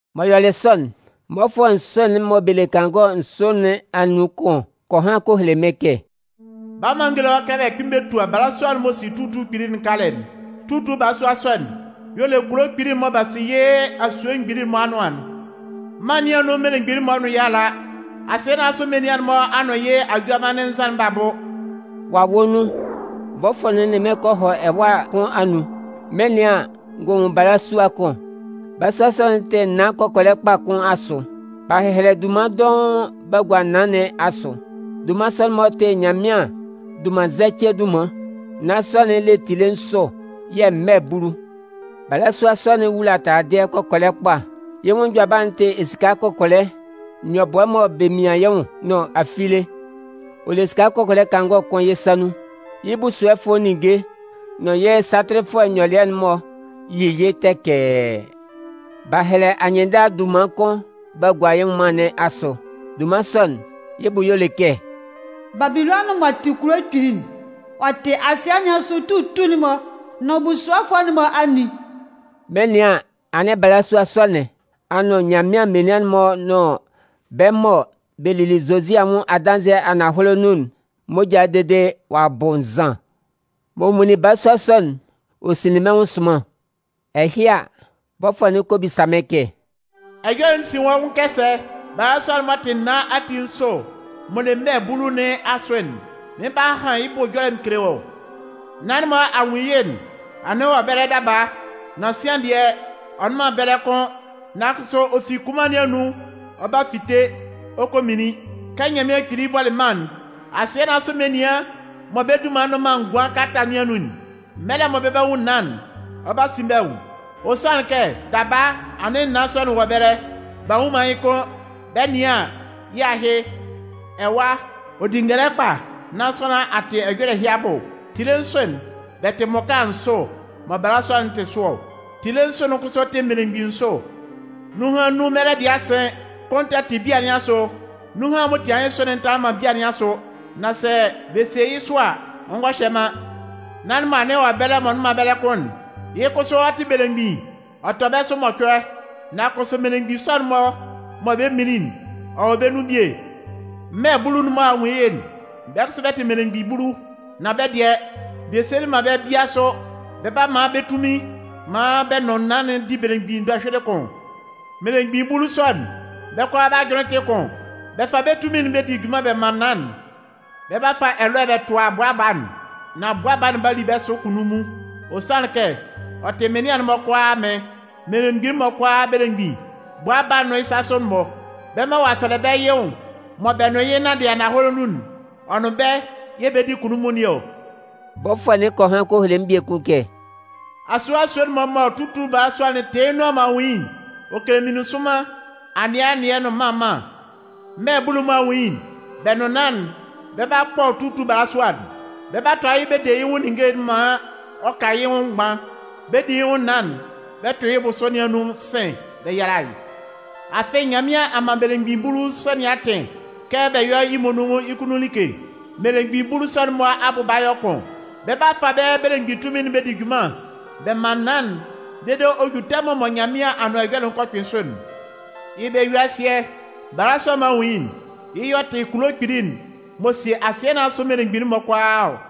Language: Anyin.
M'ɔ yɔlɩ sɔ'n, mmɔfʋɛ nsʋ'n mɔ bɛ le kangɔ nsʋ nɩn anun kʋn kɔ han kɔ hele mɩ́n kɛ: “Bala maan n géle wɔ́ kɛ bɛ 'kpɩn bɛ tua balasua'n m'ɔ si tutu'n kpili'n kalɛ'n. Tutu balasua sɔ'n, y'ɔ le kulo kpili'n mɔ b'a si yɩ́ asue mgbili'n-mɔ anʋan'n. Mân nɩn anun mmelemgbin'n-mɔ nʋn yɩ́ a la. Asɩɛ nɩn asʋ menian'n-mɔ a nʋn yɩ́ ajʋanmannɩn nzan'n b'a bʋ.” Wawɛ nun, bɔfʋɛ'n nʋn mɩ́n kɔ hɔ ɛwâ kʋn anun. Mɩn 'nɩan an, n gɔ nwun balasua kʋn. Balasua sɔ'n tɩ naan kɔkɔlɛ kpa kʋn asʋ. B'a hɛhɛlɛ dunman dɔʋn b'a gua naan nɩn asʋ. Dunman sɔ'n-mɔ tɩ Nyanmɩan dunmannzɛcɩɛ dunman. Naan sɔ'n le tile nsʋ yɛ̂ mmɛ bulu. Balasua sɔ'n wula taladɩɛ kɔkɔlɛ kpa. Yɩ́ nwʋn njʋaba'n tɩ esika kɔkɔlɛ, nyɔbʋɛ mɔ bɛ mian yɩ́ nwʋn nʋn afile. Ɔ le esika kɔkɔlɛ kangɔ kʋn yɩ́ sa nun. Yɩ́ busuɔfʋɛ ninnge nʋn yɩ́ satɩlɩfʋɛ nyɔlɩɛ'n-mɔ yi yɩ́ tɛkɛɛ. B'a hɛlɛ anyɩnndala dunman kʋn b'a gua yɩ́ nwʋnman nɩn asʋ. Dunman sɔ'n, yɩ́ bʋ y'ɔ le kɛ: “Babilɔnʋn m'ɔ tɩ kulo kpili'n, ɔ tɩ asɩɛ nɩn asʋ tutu'n-mɔ nʋn busuɔfʋɛ'n-mɔ anin.” Mɩn 'nɩan an, anɩn balasua sɔ nɩn a nʋn Nyanmɩan menian'n-mɔ nʋn bɛ́ mɔ bɛ lili Zozi anwʋn adanzɩɛ ananhɔlɛ nun'n moja'n dede ɔ'a bʋ nzan. Mɔ n nwunlin balasua sɔ'n, ɔ sinlin mɩ́n nwʋn sʋnman. Ɛhɩ a, bɔfʋɛ'n kɔ bisa mɩ́n kɛ: “Ɛjɔlɛ'n sin wɔ́ nwʋn kɛ sɛ? Balasua'n m'ɔ tɩ naan ati nsʋ m'ɔ le mmɛ bulu nɩn asʋ'n, mɩn 'ba han bɛ́ bʋ ɛjɔlɛ mɩn kele wɔ́. Naan'n mɔ a nwun yɩ́'n, anɩn ɔ wɔ ɛbɛlɛ daba, nan sian dɩɛ, ɔ nnʋn man ɛbɛlɛ kʋ́n. Nan kʋsʋ ɔ fi kunman nɩn anun ɔ 'ba fite ɔ kɔ minlin. Kɛ Nyanmɩan Kpili bɔlɩ mân'n, asɩɛ nɩn asʋ menian mɔ bɛ́ dunman nnʋn man ngʋan kalata nɩn anun'n, mɛlɛ mɔ bɛ 'ba nwun naan'n, ɔ 'ba sin bɛ́ nwʋn. Ɔ sanlɩn kɛ, daba anɩn naan sɔ'n wɔ ɛbɛlɛ, b'a nnwun man yɩ́ kʋ́n, bɛ 'nɩan an, yɩ́ ahɩ. “Ɛwa, ɔ di ngɛlɛ kpa nán sʋanlan a tɩ ɛjɔlɛ ɛhɩ abʋ. Tile nsʋ'n, bɛ tɩ mmʋka nsʋ mɔ balasua'n tɩ sʋ ɔ. Tile nsʋ'n kʋsʋ tɩ mmelemgbin nsʋ. Nunhan nnun mɛlɛ dɩɛ a sɩn. Kʋn tɛ tɩ bia nɩn asʋ. Nunhan'n m'ɔ tian yɩ́ nsʋ'n tanlanlɩn man bia nɩn asʋ. Nan sɛ bɛ sie yɩ́ sʋ a, ɔ ngɔ hyɛ man. Naan'n mɔ anɩn ɔ wɔ ɛbɛlɛ daba mɔ ɔ nnʋn man ɛbɛlɛ kʋ́n'n, yɩ́ kʋsʋ ɔ tɩ belemgbin. Ɔ tɔ bɛ́ sʋ mɔcʋɛ. Nan kʋsʋ mmelemgbin nsʋ'n mɔ bɛ 'minlin'n, ɔ wɔ bɛ́ nun bie. “Mmɛ bulu'n mɔ a nwun yɩ́'n, bɛ́ kʋsʋ bɛ tɩ mmelemgbin bulu. Nan bɛ́ dɩɛ, bɛ sielɩ man bɛ́ bia sʋ. Bɛ 'ba man bɛ́ tunmin maan bɛ nʋn naan'n di belemgbin dɔhyʋɩlɩ kʋn. Mmelemgbin bulu sɔ'n, bɛ́ kʋalaa bɛ́ ajʋnlɩn tɩ kʋn. Bɛ fa bɛ́ tunmin'n bɛ di junman bɛ man naan'n. Bɛ 'ba fa ɛlɔɛ bɛ tʋa Bʋa Baa'n. Nan Bʋa Baa'n 'ba li bɛ́ sʋ kunnunmun. Ɔ sanlɩn kɛ, ɔ tɩ mɩnlɩan'n-mɔ kʋalaa Amɩn, mmelemgbin'n-mɔ kʋalaa Belemgbin. Bʋa Baa'n nʋn yɩ́ sasʋ'n-mɔ, bɛ́ mɔ ɔ'a fɛlɛ bɛ́ yɩ́ nwʋn mɔ bɛ nʋn yɩ́ nanndɩ ananhɔlɛ nun'n, ɔ nʋn bɛ́ yɛ̂ bɛ 'di kunnunmun nɩn ɔ.” Bɔfʋɛ'n kɔ han kɔ hele mɩ́n biekun kɛ: “Asue asue'n-mɔ mɔ tutu balasua'n tɩ yɩ́ nʋan mɔ a nwun yɩ́'n, ɔ kele meninsʋnman, anɩɛ anɩɛ nʋn mân mân. Mmɛ bulu'n mɔ a nwun yɩ́'n, bɛ́ nʋn naan'n, bɛ 'ba kpɔ tutu balasua'n. Bɛ 'ba tʋa yɩ́ bɛ de yɩ́ nwʋn ninnge'n maan ɔ ka yɩ́ nwʋn mgban. Bɛ 'di yɩ́ nwʋn naan'n bɛ tʋ yɩ́ bʋsʋ nɩn anun sɩ̂n bɛ yala yɩ́. Afɩ Nyanmɩan a man mmelemgbin bulu sɔ nɩn atɩn kɛ bɛ yɔ́ yɩ́ muonun yɩ́ kunnun like. Mmelemgbin bulu sɔ'n-mɔ abʋ 'ba yɔ kʋn, bɛ 'ba fa bɛ́ belemgbin tunmin'n bɛ di junman bɛ man naan'n dede ɔ 'ju tɛmʋn mɔ Nyanmɩan Anʋan Ɛjɔlɛ'n kɔ kpɩn sʋ'n. “Yɩ́ bɛ-yue-asɩɛ, balasua'n mɔ a nwun yɩ́'n, yɩ́ y'ɔ tɩ kulo kpili'n m'ɔ sie asɩɛ nɩn asʋ mmelemgbin'n-mɔ kʋalaa ɔ.”